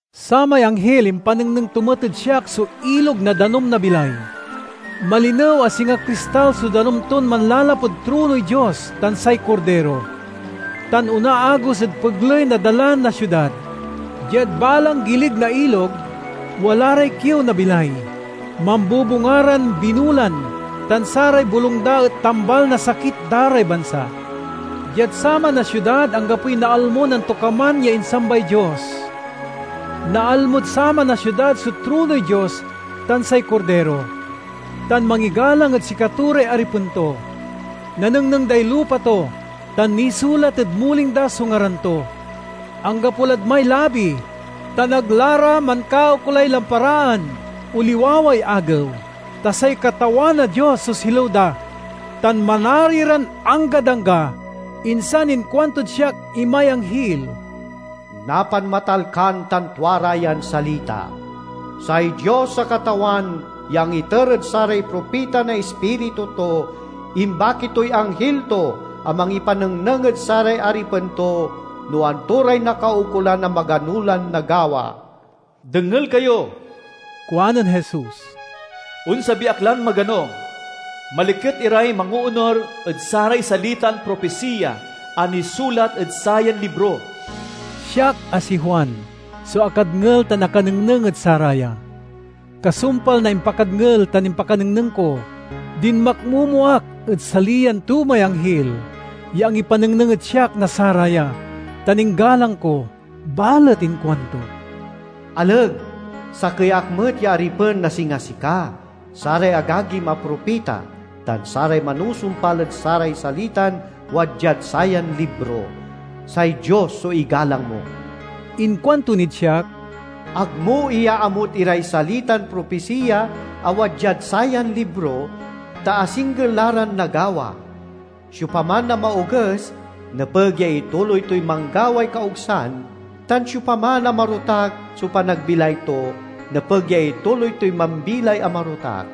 Samay anghil impanengneng to met ed siak so ilog na danum na bilay. Malinew a singa kristal so danum ton manlalapud tronoy Dios tan say Kordiro, tan onaagos ed pegley na dalan na siudad. Diad balang gilig na ilog, wala ray kiew na bilay. Mambubunga ran binulan, tan saray bolung da et tambal na sakit da ray bansa. Diad saman a siudad anggapoy naalmon antokaman ya insambay Dios. Naalmod saman a siudad so tronoy Dios tan say Kordiro, tan mangigalang ed sikato ray aripen to. Nanengneng day lupa to, tan nisulat ed muling da so ngaran to. Anggapo lad may labi, tan ag la ra mankaukolay lamparaan o liwaway agew, ta say Katawan a Dios so silew da, tan manari ran anggad angga. Insan inkuantod siak imay anghil, "Napanmatalkan tan tua ra yan salita. Say Dios a Katawan, ya angiter ed saray propita na Ispiritu to, imbaki toy anghil to a mangipanengneng ed saray aripen to no anto ray nakaukolan a magano lan nagawa." "Dengel kayo!" kuanen Jesus. "Onsabi ak lan magano. Maliket iray mangoonur ed saray salitan propisiya a nisulat ed sayan libro!" Siak, a si Juan, so akadngel tan akanengneng ed saraya. Kasumpal na impakadngel tan impakanengneng ko, dinmakmomo ak ed saliyan to may anghil ya angipanengneng ed siak na saraya tan inggalang ko. Balet inkuanto, "Aleg! Sakey ak met ya aripen a singa sika, saray agagim a propita, tan saray manusumpal ed saray salitan wadyad sayan libro. Say Dios so igalang mo!" Inkuanto nid siak, "Ag mo iyaamut iray salitan propisiya a wadyad sayan libro, ta asingger la ran nagawa. Siopaman a maoges nepeg ya ituloy toy manggaway kaogsan, tan siopaman a marotak so panagbilay to, nepeg ya ituloy toy mambilay a marotak.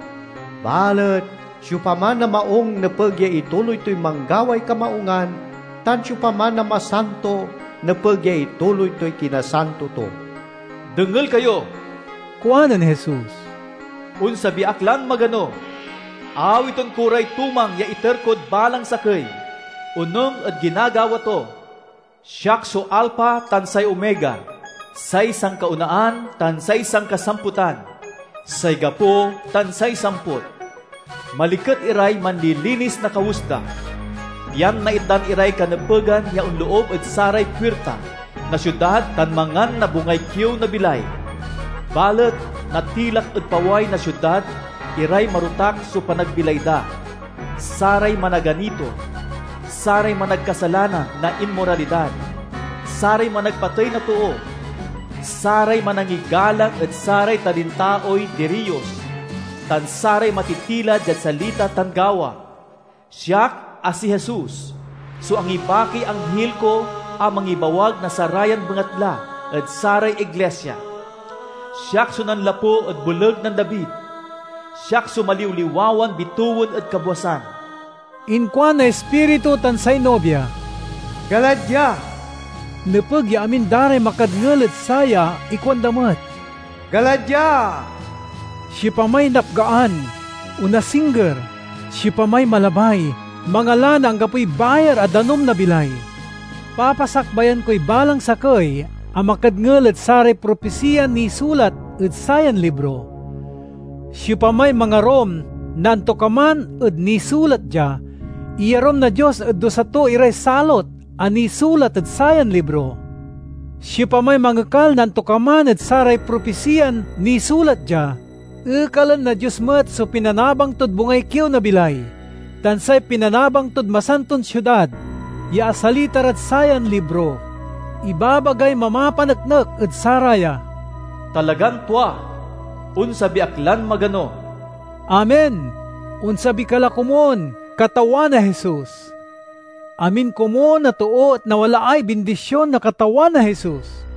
Balet siopaman a maung nepeg ya ituloy toy manggaway kamaungan, tan siopaman a masanto nepeg ya ituloy toy kinasanto to." "Dengel kayo!" kuanen Jesus. "Onsabi ak lan magano! Awiten ko ray tumang ya iter kod balang sakey, onung ed ginagawa to. Siak so Alpha tan say Omega, say sankaonaan tan say sanka-samputan, say gapo tan say samput." Maliket iray manlilinis na kawes da, pian naitdan iray kanepegan ya on-loob ed saray puirta na siudad tan mangan na bungay kiew na bilay. Balet natilak ed paway na siudad iray marotak so panagbilay da, saray managanito, saray managkasalanan na inmoralidad, saray managpatey na too, saray manangigalang ed saray talintaoy diriyos, tan saray matitila diad salita tan gawa. "Siak, a si Jesus, so angibakiy anghil ko a mangibawag na sarayan bengatla ed saray iglisia. Siak so nanlapu ed boleg nen David. Siak so maliwliwawan bitewen ed kabwasan." Inkuan na Ispiritu tan say Nobia, "Gala dia!" Nepeg ya amin da ray makadngel ed saya ikuanda met, "Gala dia!" Siopamay napgaan, onasingger; siopamay malabay, mangala na anggapoy bayar a danum na bilay. Papasakbayan koy balang sakey a makadngel ed saray propisiyan nisulat ed sayan libro: siopamay mangarum na antokaman ed nisulat dia, iyarum na Dios ed dusa to iray salot a nisulat ed sayan libro. Siopamay mangekal na antokaman ed saray propisiyan nisulat dia, ekalen na Dios met so pinanabang tod bungay kiew na bilay tan say pinanabang tod Masantod Siudad, ya asalita rad sayan libro. Ibabagay mamapaneknek ed saraya, "Talagan tua! Onsabi ak lan magano!" Amen. Onsabi ka la komun, Katawan a Jesus! Amin komun a too et nawalaay bindision na Katawan a Jesus.